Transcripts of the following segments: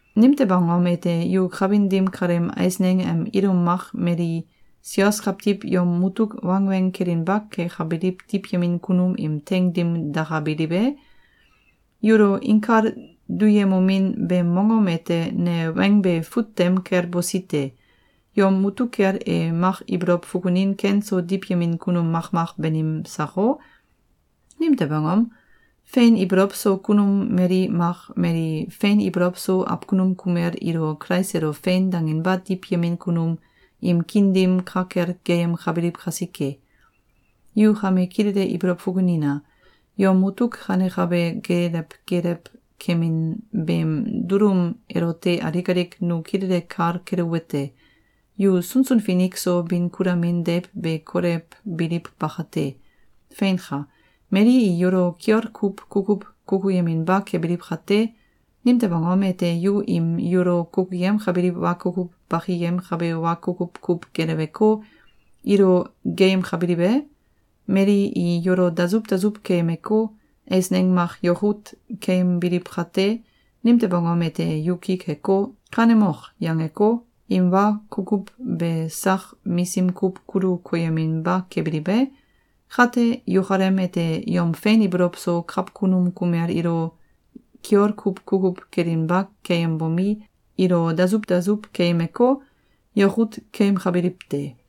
Nimtew angom ete yu kawin dim kaleem eisneng em ilum mak mali sios kawtiw yom mutuk wangweng kelinba kekabiliw diwyemin kunum im teing dim dakabiliw e? Yulo inkal duyemomin beem mongom ete ne weng be fut tem kel bosi te. Yom mutuk kel e mak ibolow fukunin ken so diwyemin kunum makmak banim sako? Nimtew angom? Fein ibolow so kunum mali mak mali fein ibolow so awkunum kumel ilo Kulais elo “Fein!”, danginba diwyemin kunum im kiin dim ka kel geeyemkabiliw kasike. Yu kame kilele ibolow fukunina! Yom mutuk kanekabe geelew geelew kemin beem dulum elote alik alik nu kilele kal keluwete: Yu sunsun finik so bin kulamin deiw be kolewbiliw bakate. Feinka! Mali i yulo kiol kuw kukuw kukuyeminba kebiliw kate, nimtew angom ete yu im yulo kukuyemkabiliw wa kukuw bakiyemkabe wa kukuw kuw geleweko, ilo geeyemkabiliw e? Mali i yulo dasuw dasuw keyemeko, eisneng mak yakut keyembiliw kate, nimtew angom ete yu ki keko, “Kanemok!”, yangeko, im wa kukuw be sak misim kuw kulu koyeminba kebiliw e? Kate, yukalem ete yom fein ibolow so kawkunum kumel ilo kiol kuw kukuw kelinba keyembomi, ilo dasuw dasuw keyemeko, yakut keyemkabiliw te.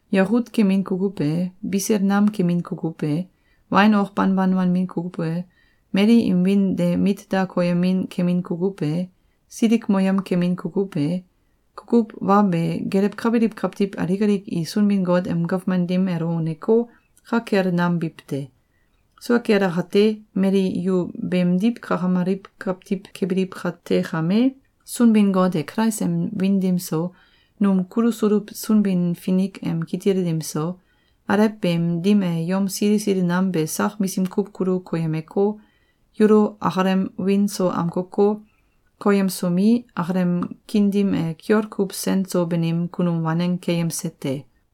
yakut kemin kukuw e, bisil nam kemin kukuw e, wain ok banban wanbin kukuw e, mali im wiin de mit da koyemin kemin kukuw e, silikmoyem kemin kukuw e, kukuw wa be gelewkabiliw kawtiw alik alik i Sunbin-Got em gawman dim elo uneko, ka kel nam biw te. Sua kel akate, mali yu beemdiw kakamaliw kawtiw kebiliw kate kame, Sunbin-Got e Kulais em wiin dim so, num kulusuluw Sunbin-Finik em kitil dim so, alew beem dim e yom sili sili nam be sak misim kuw kulu koyemeko, yulo akalem wiin so amkoko, koyemsomi, akalem kiin dim e kiol kuw sen so banim kunum waneng keyemse te.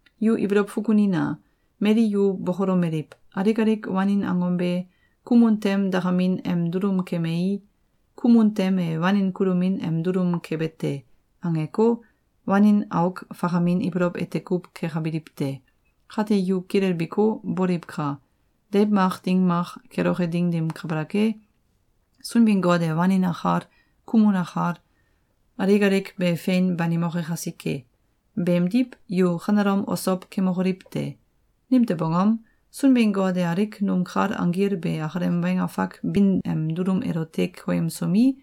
Yu ibolow fukunina! Mali yu bokolomeliw: “Alik alik wanin angom be, kumun tem dakamin em dulum kemei, kumun tem e wanin kulomin em dulum kebe te.”, angeko, wanin auk fakamin ibolow ete kuw kekabiliw te. Kate yu kilelbiko, boliwka! Deiw mak ding mak keloke ding dim kabalak e, Sunbin-Got e wanin akal, kumun akal, alik alik be fein banimoke kasike! Beemdiw, yu kanelom osow kemokoliw te! Nimtew angom? Sunbin-Got e alik num kal anggil be akalem weng afak bin em dulum elote koyemsomi,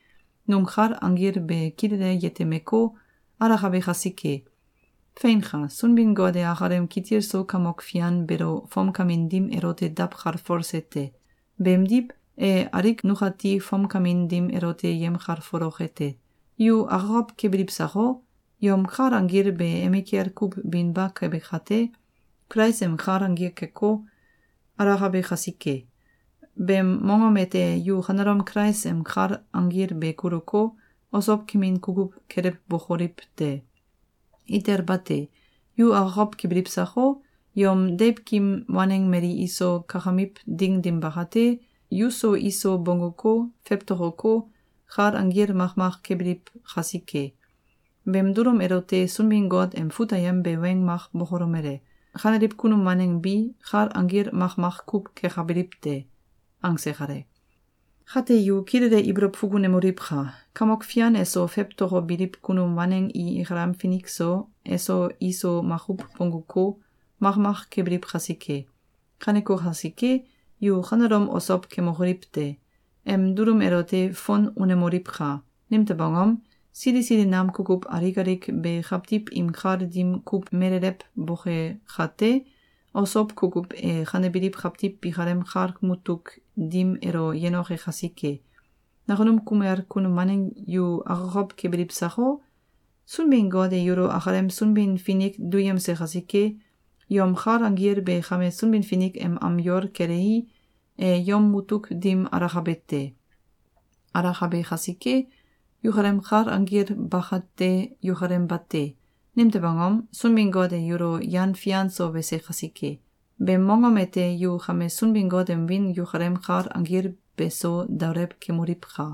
num kal anggil be kilele yetemeko, alakabe kasike. Feinka! Sunbin-Got e akalem kitil so Kamok Fian beelo fomkamin dim elote dawkalfolse te. Beemdiw, e alik nukati fomkamin dim elote yemkalfoloke te. Yu akokow kebiliw sako? Yom kal anggil be emikel kuw binba kebe kate, Kulais em kal anggil keko, alakabe kasike. Beem mongom ete yu kanelom Kulais em kal anggil be kuluko, osow kemin kukuw kelewbokoliw te! Itel bate! Yu akokow kebiliw sako? Yom deiwkim waneng mali iso kakamiw ding dim bakate, yuso iso bongguko, fewtokoko, kal anggil makmak kebiliw kasike. Beem dulum elote Sunbin-Got em fut ayem be weng mak bokolomele: “Kaneliw kunum waneng bi, kal anggil makmak kuw kekabiliw te.”, angse kale. Kate yu kilele ibolow fukunemoliwka! Kamok Fian eso fewtokobiliw kunum waneng i ikalem finik so, eso iso makuw bongguko, makmak kebiliw kasike. Kaneko kasike, yu kanelom osow kemokoliw te! Em dulum elote fon unemoliwka! Nimtew angom? Sili sili nam kukuw alik alik be kawtiw im kal dim kuw melelewboke kate, osow kukuw e kanebiliw kawtiw bikalem kal mutuk dim elo yenoke kasike. Nakunum kumel kunum waneng yu akokow kebiliw sako? Sunbin-Got e yulo akalem Sunbin-Finik duyemse kasike, yom kal anggil be kame Sunbin-Finik em am yol kelei, e yom mutuk dim alakabe te. Alakabe kasike, yukalem kal anggil bakate yukalem bate! Nimtew angom? Sunbin-Got e yulo yan fian so wese kasike. Beem mongom ete yu kame Sunbin-Got em wiin yukalem kal anggil beso daolew kemoliwka!